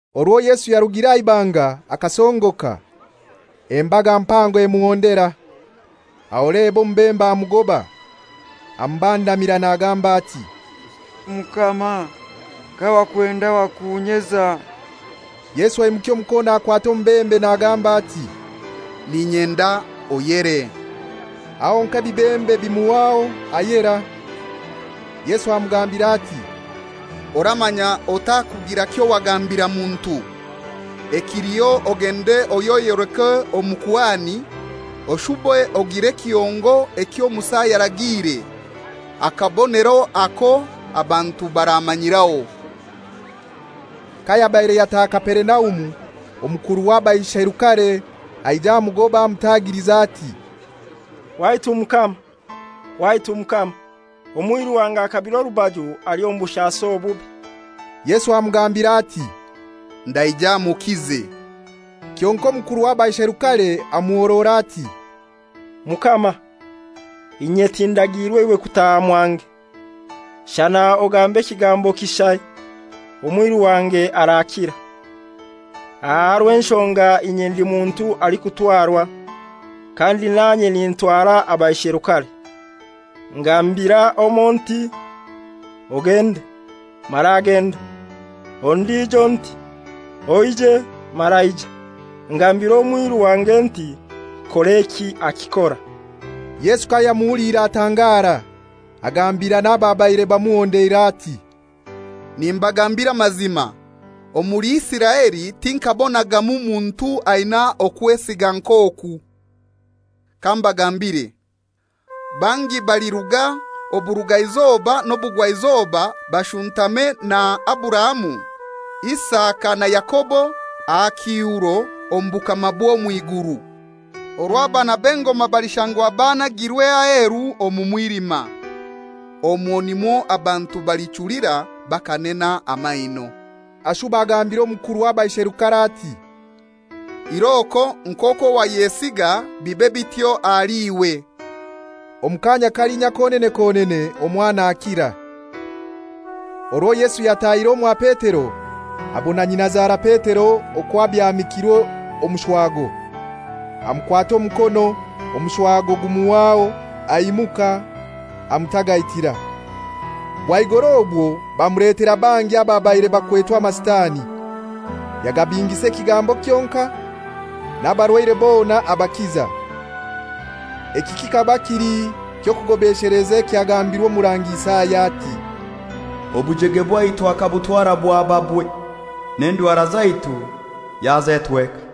Orwo Yesu yarugire aha ibanga akasongoka, embaga mpango emuhondera. Aho leba omubembe amugoba, amubandamira nagamba ati, «Mukama, kawakwenda wakunyeza.» Yesu aimukya omukono akwata omubembe nagamba ati, «N'inyenda, oyere.» Aho honkai ebibembe bimuhwaho, ayera. Yesu amugambira ati, «Oramanya otakugira kyowagambira muntu. Ekiliho ogende oyeyoleke omukuhani, oshube ogire n'ekihongo ekyo Musa yaragiire, akabonero ako abantu baramanyiraho.» Kayabaire yataha Kaperinaumu, omukuru w'abaisherukare aija amugoba, amutagiliza, ati, «Waitu Mukama, waitu Mukama, omwiru wange akabire orubaju ali omu bushasi obubi.» Yesu amugambira ati, «Ndaija mukize.» Kyonkai omukuru w'abaisherukare amuhorora ati, «Mukama, inye tindagiirwe iwe kutaha mwange; shana ogambe ekigambo kishai, omwiru wange arakira. Aha rw'enshonga inye ndi muntu alikutwarwa, kandi nanye nintwara abaisherukare. Ngambira omoi nti, ‹Ogende,› mara agenda; ondijo nti, ‹Oije,› mara aija. Ngambira omwiru wange nti, ‹Kor'eki,› akikora.» Yesu kayamuhuliire atangara, agambira n'ababaire bamuhondeire ati, «Nimbagambira amazima, omuli Isiraeli tinkaabonagamu muntu aina okwesiga nk'oku. Kambagambire: Bangi baliruga oburugaizoba n'obugwaizoba bashuntame na Aburahamu, Isaka na Yakobo aha kiihuro omu bukama bw'omw'iguru, orwo abaana b'engoma balishangwa banagirwe aheru omu mwilima; omwo nimwo abantu balichulira bakanena amaino.» Ashuba agambira omukuru w'abaisherukare ati, «Iroko, nk'okwo wayesiga bibe bityo ahali iwe.» Omu kaanya kalinya konene konene omwana akira. Orwo Yesu yatahire omwa Petero, abona nyinazara Petero okwo abyamikirwe omushwago. Amukwata omukono omushwago gumuhwaho, aimuka amutagaitira. Bwaigoro obwo bamuletera bangi ababaire bakwetwe amasitani. Yagabingisa ekigambo kyonkai n'abarwaire bona abakiza. Eki kikaba kili ky'okugobesheleza ekyagambirwe Omurangi Isaya ati, «Obujege bwaitu akabutwara bwaba bwe, n'endwara zaitu yazetweka.»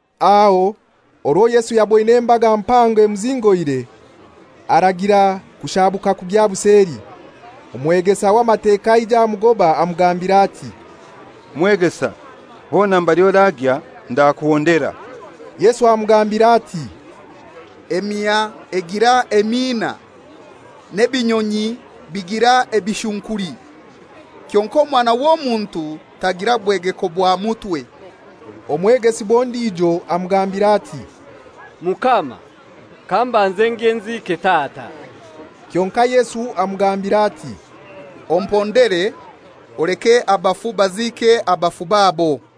Aho orwo Yesu yaboine embaga mpango emuzingoire, aragira kushaabuka kugya buseli. Omwegesa w'Amateka aija amugoba amugambira ati, «Mwegesa, hona mbali oragya ndakuhondera.» Yesu amugambira ati, «Emiha egira emiina, n'ebinyonyi bigira ebishunkuli; kyonkai omwana w'Omuntu tagira bwegeko bwa mutwe.» Omwegesibwa ondijo amugambira ati, «Mukama, kambanze ngye nziike tata.» Kyonkai Yesu amugambira ati, «Ompondere, oleke abafu baziike abafu babo.»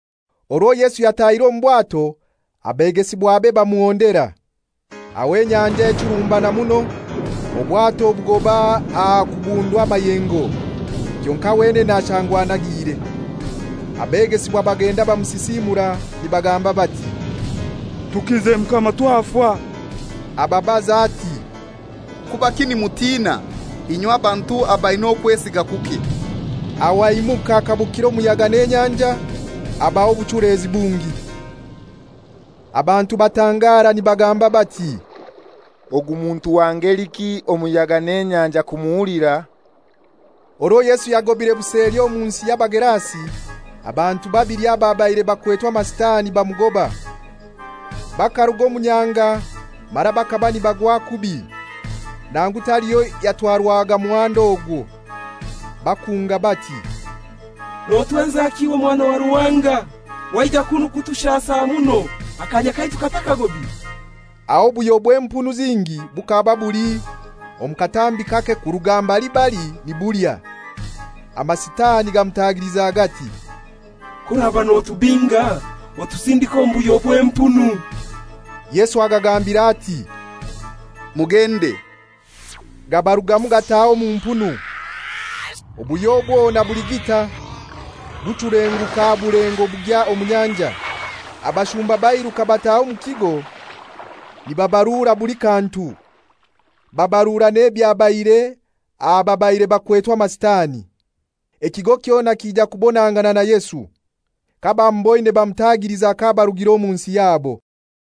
Orwo Yesu yatahire omu bwato abegesibwabe bamuhondera. Aho enyanja echurumbana muno, obwato bugoba aha kubundwa amayengo, kyonkai wenene ashangwa anagiire. Abegesibwa bagenda bamusisiimura, nibagamba bati, «Tukize Mukama, twafa.» Ababaza ati, «Kubaki nimutina, inywe bantu abaina okwesiga kuke?» Aho aimuka akabukira omuyaga n'enyanja, habaho obuchulezi bungi. Abantu batangara nibagamba bati, «Ogu muntu owa ngeliki, omuyaga n'enyanja kumuhulira?» Orwo Yesu yagobire buseli omu nsi y'Abagerasi, abantu babili ababaire bakwetwe amasitani bamugoba; bakaruga omu nyanja mara bakaba nibagwa kubi, nangu taliho yatwarwaga muhanda ogwo. Bakunga bati, «Notwenzaki iwe Mwana wa Ruhanga? Waija kunu kutushasa muno akanya katakagobire?» Aho obuhyo bw'empunu zingi bukaba buli omu katambi kake kuruga mbali bali nibulya. Amasitani gamutagiliza gati, «K'oraba notubinga, otusindike omu buhyo bw'empunu.» Yesu agagambira ati, «Mugende.» Gabarugamu gataha omu mpunu. Obuhyo bwona buligita buchulenguka aha bulengo bugwa omu nyanja. Abashumba bairuka bataha omu kigo nibabarura buli kantu, babarura n'ebyabaire aha babaire bakwetwe amasitani. Ekigo kyona kija kubonangana na Yesu. Kabamuboine bamutagiliza k'abarugira omu nsi yabo.